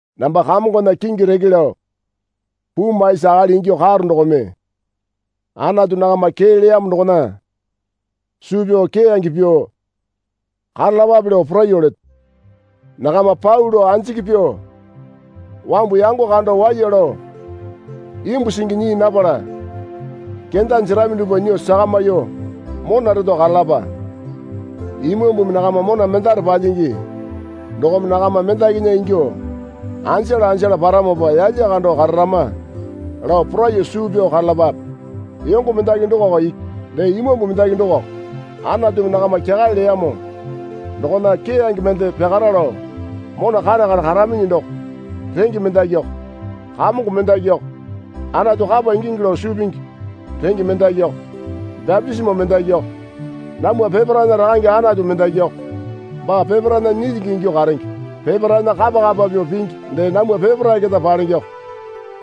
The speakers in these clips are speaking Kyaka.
Namba Kamongona kingi reke lao puu maisi akali ingyuo karo dokome Anatu nakama kee leyamo dokona suu pyao keyange pyuo karalapape lao poraiyuo leto. Nakama pau lao anjiki pyuo wambu yango kando waiya lao imbu singi nyii napala kenda jerami dupwa nyuo sakamyuo mona reto karalapa. Imambumi nakama mona mendare palyingi dokome nakama mendakinya ingyuo anjala anjala paramopa yalya kando kararama lao poraiyuo suu pyao karalapape. Yongo mendaki dokako iki. Dee Imambu mendaki dokako. Anatumi nakama kyakale leyamo dokona keyange mende pyakara lao mona kare kare karaminyi doko renge mendakiko. Kamongo mendakiko, Anatu kapa ingingi lao suu pingi renge mendakiko, bapitisimo mendakiko. Namwa peparaena Rakange Anatu mendakiko, baa peparaena nyilyingi ingyuo karenge. Peparaena kapa kapa pyuo pingi dee namwa peparae keta palengeko.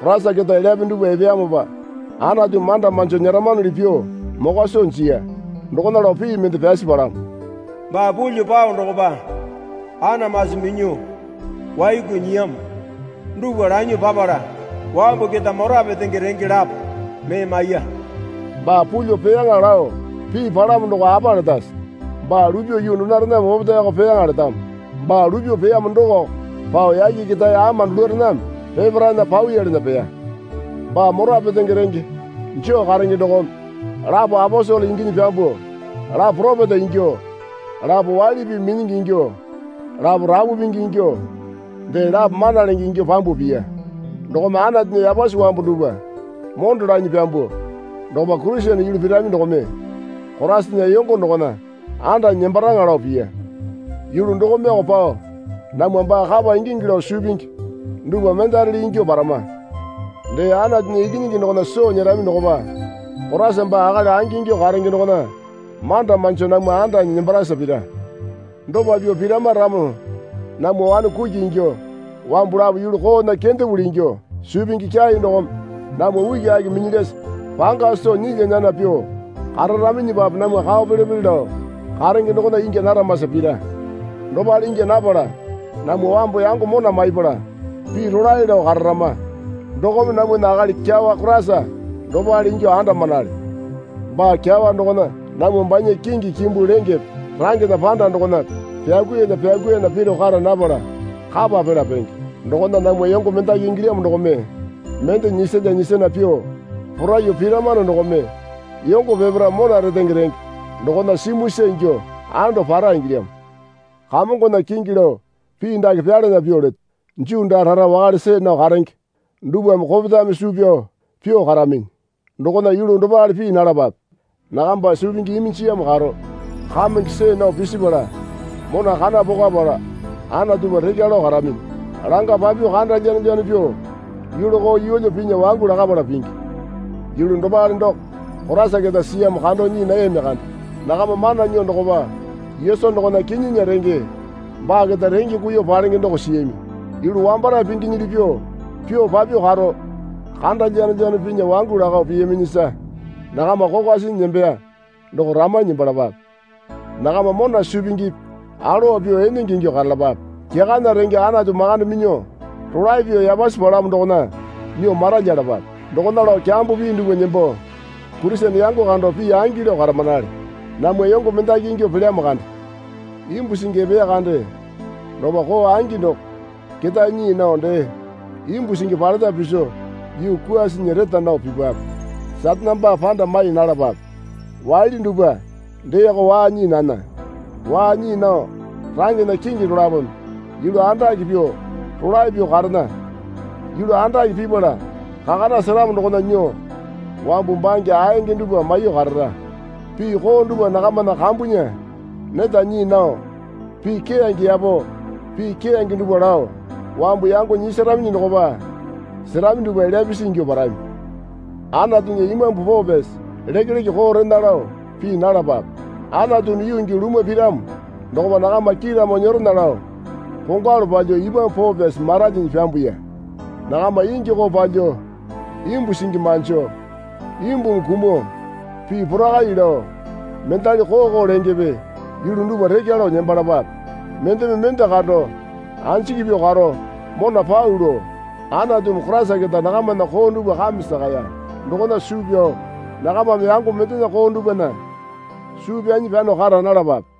Koraisa keta elyape dupwa epeyamopa Anatumi manda manjo nyeramanuli pyuo mokwa soo jiya. Dokona lao pii mende pyasi palamo. Baa pulyuo pao dokopa anamasi minyuo waiku nyiyamo dupwa lanyuo papala wambu keta mora petenge renge lapo mee maiya. Baa pulyuo peyaŋa lao pii palamo doko apa letase? Baa lupyuo yuu donorename opetaeko peyaŋa letamo. Baa lupyuo peyamo dokoko pao yake ketae ama dulurename peparaena pawiyalana peya. Baa mora petenge renge joo karenge dokome, lapo aposele inginyi pyambuo, lapo poropeta ingyuo, lapo waili pii minyingi ingyuo, lapo rapu pingi ingyuo, dee lapo mana lenge ingyuo pyambuo piya. Dokome Anatunya yapasi wambu dupwa mondo lanyi pyambuo dokopa Kurisene yulu pirami dokome Koraisana yongo dokona andanyi nembaraŋa lao piya. Yulu dokomeoko pao namwa baa kapa ingingi lao suu pingi dupwa mendarele ingyuo parama. Dee Anatunya Ikinyingi dokona soo nyerami dokopa, Koraisa baa akali angingyuo karenge dokona manda manjo namwa andanyi nembarasa pira. Dopa pyuo pirama ramo namwa wane kuki ingyuo wambu lapo yulu koona kendapuli ingyuo suu pingi kyai dokome namwa ukiaki minyilyasa panga soo nyilya nyana pyuo kararaminyipape namwa kao pele pele lao karenge dokona ingya naramasa pira. Dopale ingya napala namwa wambu yango mona maipala pii rolae lao kararama dokome namwana akali kyawa Koraisa dopale ingyuo andamanale. Baa kyawa dokona namwa banya kingi kimbu lengepe rangena panda dokona pyakuiyalya pyakuiyana piro kara napala kapa pela penge. Dokona namwa yongo mendaki ingilyamo dokome mende nyisalya nyisana pyuo poraiyuo piramano dokome yongo peparae mona retenge renge dokona simuisa ingyuo ando para ingilyamo. Kamongona kingi lao pii dake pyalana pyuo leto. Juu daa rara wakale see nao karenge dupwame kopetame suu pyao pyuo karaminyi dokona yulu dopale pii nalapape. Nakamba suu pingi iminjiyamo karo, kamenge see nao pisipala mona kana pokwapala Anatupa rekya lao karaminyi. Langa papyuo kanda lyanolyano pyuo yulu koo yeelyo pinya wangu lakapala pingi. Yulu dopale doko Koraisa keta siyamo kando nyii nayami kande. Nakama mana nyuo dokopa Yesu dokona kinyinya renge baa keta renge kuiyuo palenge doko siyami. Yulu wambarae pinginyili pyuo, pyuo papyuo karo kanda lyanolyano pinya wangu lakao piyaminyisa nakama kokwa sinyi nembeya doko ramanyi nembalapape. Nakama mona suu pingipi alowa pyuo enenge ingyuo karalapape. Kyakana renge Anatu makande minyuo rolae pyuo yapasi palamo dokona nyuo maralyalapape. Dokona lao kyambo pii dupwa nembo Kurisene yango kando pii angi lao karamanale. Namwa yongo mendaki ingyuo pelyamo kande. Imbu singi epeya kande dokopa koo angi doko ketae nyii nao dee imbu singi paleta piso yuu kwuasinyi reta nao pipape. Satane baa panda mai nalapape. Waali dupwa deeko waa nyii nana. Waa nyii nao rangena kingi dolapome yulu andake pyuo rolae pyuo karena. Yulu andake pipala kakana seramo dokona nyuo wambu bange aeyange dupwa maiyuo karara. Pii koo dupwa nakamana kambunya neta nyii nao pii keyange yapo, pii keyange dupwa lao wambu yango nyisaraminyi dokopa serami dupwa elya pisi ingyuo parami. Anatunya Imambu Poo Pyasi lekeleke koo rena lao pii nalapape. Anatumi yuu gii lumwa piramo dokopa nakama kiiramo nyeronya lao kongwalu palyuo Imambu Poo Pyasi maralyinyi pyambuya. Nakama ingi koo palyuo, imbu singi manjo, imbumi kumuo, pii porakai lao, mendali koo koo lengepe yulu dupwa rekya lao nembalapape. Mendeme mende kando anjiki pyuo karo mona pau lao, Anatumi Koraisa keta nakamana koo dupwa kame sakaya dokona suu pyao nakamame yango mendena koo dupwana suu pyanyi pyano kara nalapape.